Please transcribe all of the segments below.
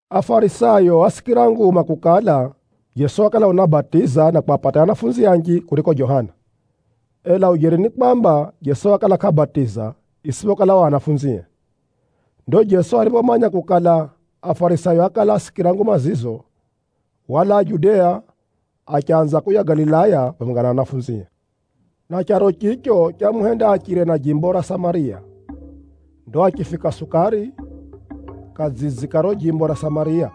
Afarisayo ásikira nguma kukala, Jeso wakala unabatiza na kwapata anafunzi anji kuriko Johana. (Ela ujeri ni kwamba, Jeso wakala kʼabatiza itsʼiphokala ao anafunzie.) Ndo Jeso Nakala zinjine zinaamba: Bwana. ariphomanya kukala, Afarisayo ákala asikira nguma zizo, walaa Judea achanza kuuya Galilaya phamwenga na anafunzie, na charo chicho, chamuhenda achire na jimbo ra Samariya. Ndo achifika Sukari, kadzidzi kariko riro jimbo ra Samariya,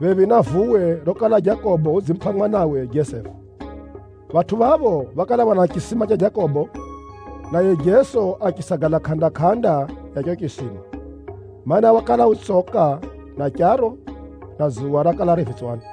phephi na vuwe rokala Jakobo udzimupʼa mwanawe Jesefu. Phatʼu phapho, phákala phana chisima cha Jakobo, naye Jeso achisagala kʼanda-kʼanda ya chicho chisima, mana, wakala utsoka na charo, na dzuwa rakala riimire vitswani.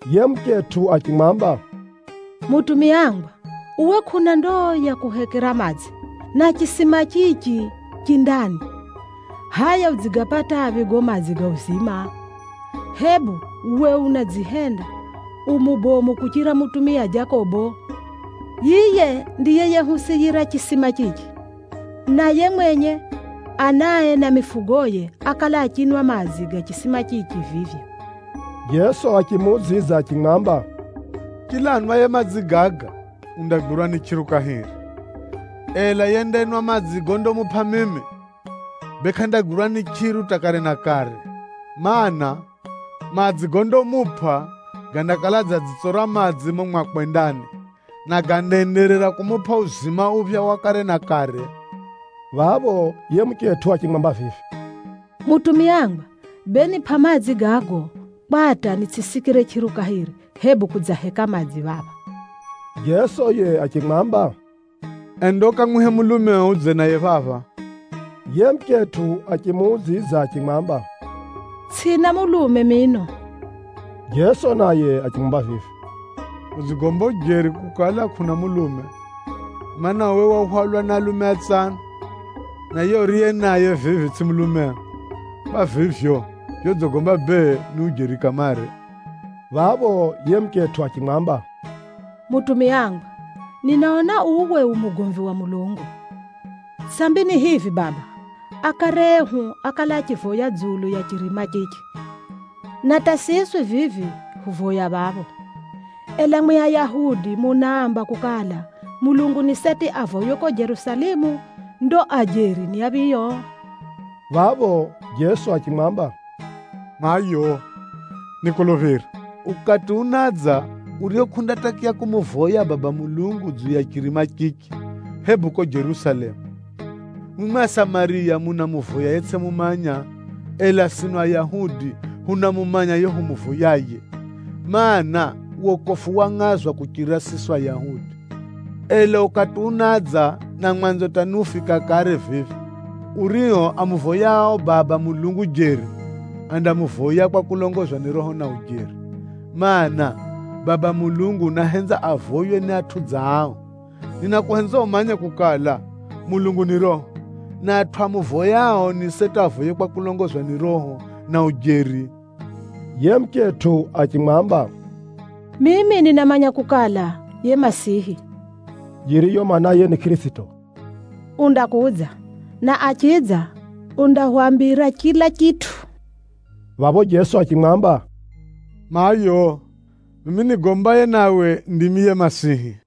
Yiye muchetʼu achimwamba, “Mutumiangwa, uwe kʼuna ndoo ya kuhekera madzi, na chisima chichi chindani. Hʼaya udzigapataphi gago madzi ga uzima? Hebu, uwe unadzihenda u mubomu kuchira mutumia Jakobo? Yiye ndiye yehusiyira chisima chichi, na yiye mwenye, anae na mifugoye ákala achinwa madzi ga chisima chichi vivyo.” Jeso achimuudzidza achimwamba, “Chila anwaye madzi gaga, undagwirwa ni chʼiru kahiri. Ela yendanwa madzi gondamupʼa mimi, bee kʼandagwirwa ni chʼiru hata kare na kare. Maana, madzi gondamupʼa gandakala dza dzitso ra madzi mumo mwakwe ndani, na gandaenderera kumupʼa uzima uphya wa kare na kare.” Phapho yiye muchetʼu achimwamba vivi, “Mutumiangwa, bee nipʼa madzi gago kwa hata nitsʼisikire chʼiru kahiri, hebu kudzaheka madzi phapha.” Jeso yiye achimwamba, “Enda ukamwihe mulumeo udze naye phapha.” Yiye muchetʼu achimuudzidza achimwamba, “Tsʼina mulume mino.” Jeso naye achimwamba vivi, “Udzigomba ujeri kukala, kʼuna mulume. Mana, uwe wahwalwa ni alume atsano, na yiye uriye naye vivi tsʼiye mulumeo. Kwa vivyo, vyodzigomba bee, ni ujeri kamare.” Phapho yiye muchetʼu achimwamba, “Mutumiangwa, ninaona uwe u mugomvi wa Mulungu. Sambi ni hivi baba, akare ehu ákala achivoya dzulu ya chirima chichi, na hata siswi vivi huvoya phapho. Ela mwimwi Ayahudi munaamba kukala, Mulungu ni seti avoywe kuko Jerusalemu! Ndo ajeri ni aphio?” Phapho Jeso achimwamba, “Mayo, nikuluphira. Ukati unadza urio kʼundatakiya kumuvoya Baba Mulungu dzulu ya chirima chichi, hebu kuko Jerusalemu. Mwimwi Asamariya munamuvoya yetsʼimumanya, ela sino Ayahudi hunamumanya yiye humuvoyaye. Maana, wokofu wangʼazwa kuchirira siswi Ayahudi. Ela ukati unadza, na mwanzo hata ni ufika kare vivi, urio amuvoyao Baba Mulungu jeri, andamuvoya kwa kulongozwa ni Roho na ujeri, mana, Baba Mulungu unahenza avoywe ni atʼu dza ao. Ninakuhenza umanye kukala, Mulungu ni Roho, na atʼu amuvoyao ni seti avoye kwa kulongozwa ni Roho, na ujeri.” Yiye muchetʼu achimwamba, “Mimi ninamanya kukala, yiye Masihi” (yiriyo maanaye ni Kʼirisito), “undakudza. Na achidza, undahwambira chila chitʼu.” Phapho Jeso achimwamba, “Mayo, mimi nigombaye nawe ndimi yiye Masihi.”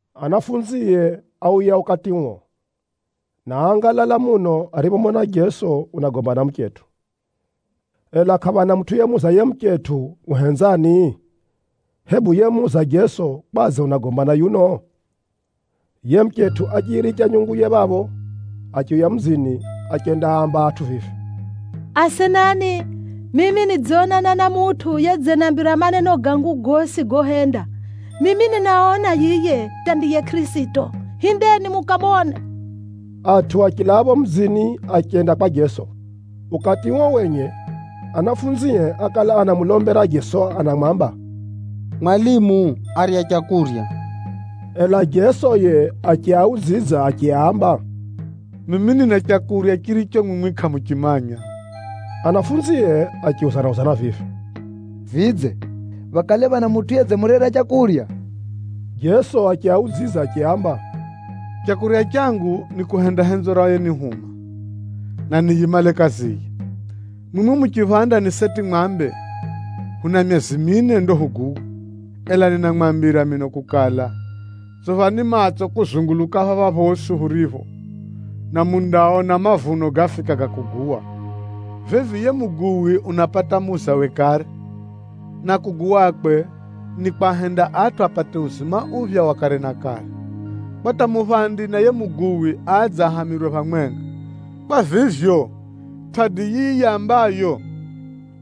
Anafunzie áuya ukati uo, na áangalala muno ariphomona Jeso unagomba na muchetʼu. Ela kʼaphana mutʼu yemuuza yiye muchetʼu, “Uhenzani?” Hebu yemuuza Jeso, “Kwadze unagomba na yuno?” Yiye muchetʼu achiyiricha nyunguye phapho, achiuya mudzini achendaamba atʼu vivi, “Asenani! Mimi nidzonana na mutʼu yedzinambira maneno gangu gosi nirigohenda! Mimi ninaona yiye hata ndiye Kʼirisito. Hindeni mukamone!” Atʼu achilaa phapho mudzini, achenda kwa Jeso. Ukati uo wenye, anafunzie ákala anamulombera Jeso anamwamba, “Mwalimu, arya leu.” Ela Jeso yiye achiaudzidza achiaamba, “Mimi nina leu riro mwimwi kʼamurimanya.” Anafunzie achiuzana-uzana vivi, “Vidze, phakale phana mutʼu yedzimurehera leu?” Jeso achiaudzidza achiaamba, “Leu rangu ni kuhenda henzo ra yenihuma, na niyimale kaziye. Mwimwi muchiphanda ni seti mwambe, huna myezi mine ndo huguwe. Ela ninamwambira mino kukala, tsuphani matso kuzunguluka phapha phosi huripho, na mundaona mavuno gafika ga kuguwa. Vivi yiye muguwi unapata muzawe kare, na kuguwakwe ni kwahenda atʼu apate uzima uphya wa kare na kare, kwa hata muphandi na yiye muguwi adze ahamirwe phamwenga. Kwa vivyo, tʼadi yiyi yambayo,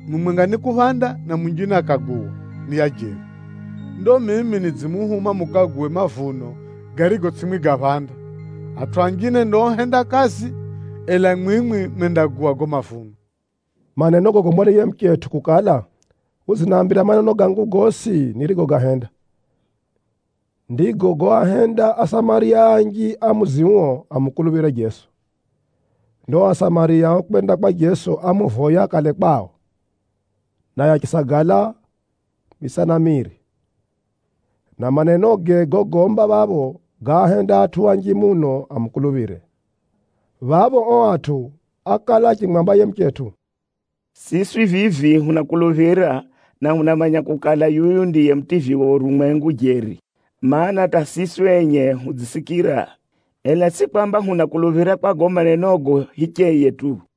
‘Mumwenga ni kuphanda na munjine akaguwa,’ ni ya jeri. Ndo mimi nidzimuhuma mukaguwe mavuno garigo tsʼimwi gáphanda. Atʼu anjine ndio ohenda kazi, ela mwimwi mwendaguwa gago mavuno.” Maneno gogombwa ni yiye muchetʼu kukala, “Udzinambira maneno gangu gosi nirigohenda” ndigo goahenda Asamariya anji a mudzi uo amukuluphire Jeso. Ndo ao Asamariya okwenda kwa Jeso ámuvoya akale kwao, naye achisagala mitsana miiri. Na manenoge gogomba phapho gáahenda atʼu anji muno amukuluphire. Phapho ao atʼu ákala achimwamba yiye muchetʼu, “Siswi vivi hunakuluphira na hunamanya kukala, yuyu ndiye Mutivyi wa urumwengu jeri, mana, hata siswi enye hudzisikira, ela tsʼi kwamba hunakuluphira kwa gago manenogo hicheye tu.”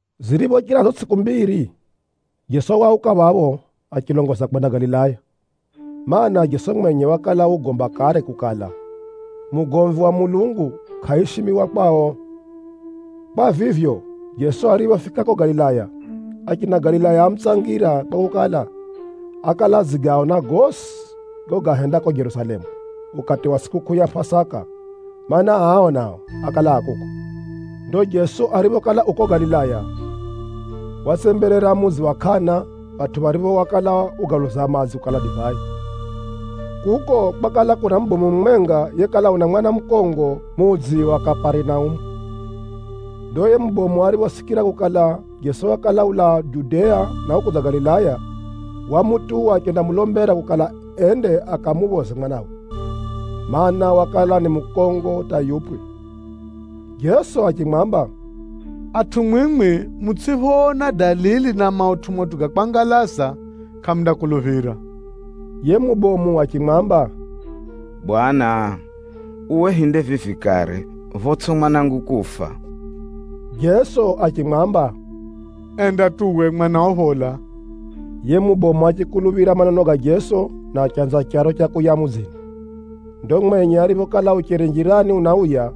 Ziriphochira zizo tsʼiku mbiri, Jeso wauka phapho achilongoza kwenda Galilaya. Maana, Jeso mwenye wakala ugomba kare kukala, “Mugomvi wa Mulungu kʼaishimiwa kwao.” Kwa vivyo, Jeso ariphofika kuko Galilaya, achina Galilaya ámutsangira kwakukala, ákala adzigaona gosi gogahenda kuko Jerusalemu ukati wa tsʼikukʼuu ya Pʼasaka, mana, ao nao ákala a kuko. Ndo Jeso ariphokala u kuko Galilaya, watsemberera mudzi wa Kana phatʼu pharipho wakala ugaluza madzi kukala divai. Kuko, kwakala kuna mubomu mumwenga yekala una mwana mukongo yupwi kuko mudzi wa Kaparinaumu. Ndo yiye mubomu ariphosikira kukala, Jeso wakala ulaa Judea na ukudza Galilaya, wamutuwa, achendamulombera kukala, ende akamuphoze mwanawe, mana, wakala ni mukongo hata yupwi! Jeso achimwamba, “Atʼu mwimwi mutsʼiphoona dalili na mautʼu-mautʼu ga kwangalaza, kʼamundakuluphira!” Yiye mubomu achimwamba, “Bwana, uwe hinde vivi kare, photsʼi mwanangu kufa.” Jeso achimwamba, “Enda tu we, mwanao uphola.” Yiye mubomu achikuluphira maneno ga Jeso, na achanza charo cha kuuya mudzini. Ndo mwenye ariphokala ucheri njirani unauya,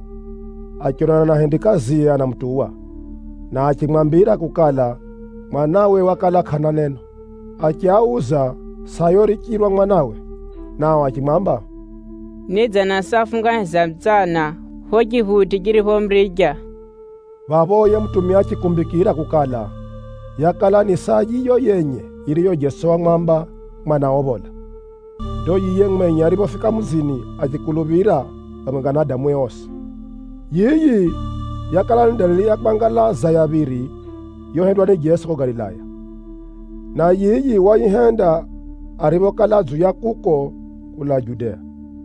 achionana na ahendikazie anamutuwa, na achimwambira kukala, mwanawe wakala kʼana neno. Achiauza saa yorichirwa mwanawe, nao achimwamba, “Ni dzana saa fungahe za mutsana pho chiphuti chiriphomuricha.” Phapho yiye mutumia achikumbikira kukala, yakala ni saa yiyo yenye yiriyo Jeso wamwamba, “Mwanao uphola.” Ndo yiye mwenye ariphofika mudzini, achikuluphira phamwenga na adamue osi. Yiyi yakala ni dalili ya kwangalaza ya phiri yohendwa ni Jeso kuko Galilaya, na yiyi wayihenda ariphokala adzuya kuko kulaa Judea.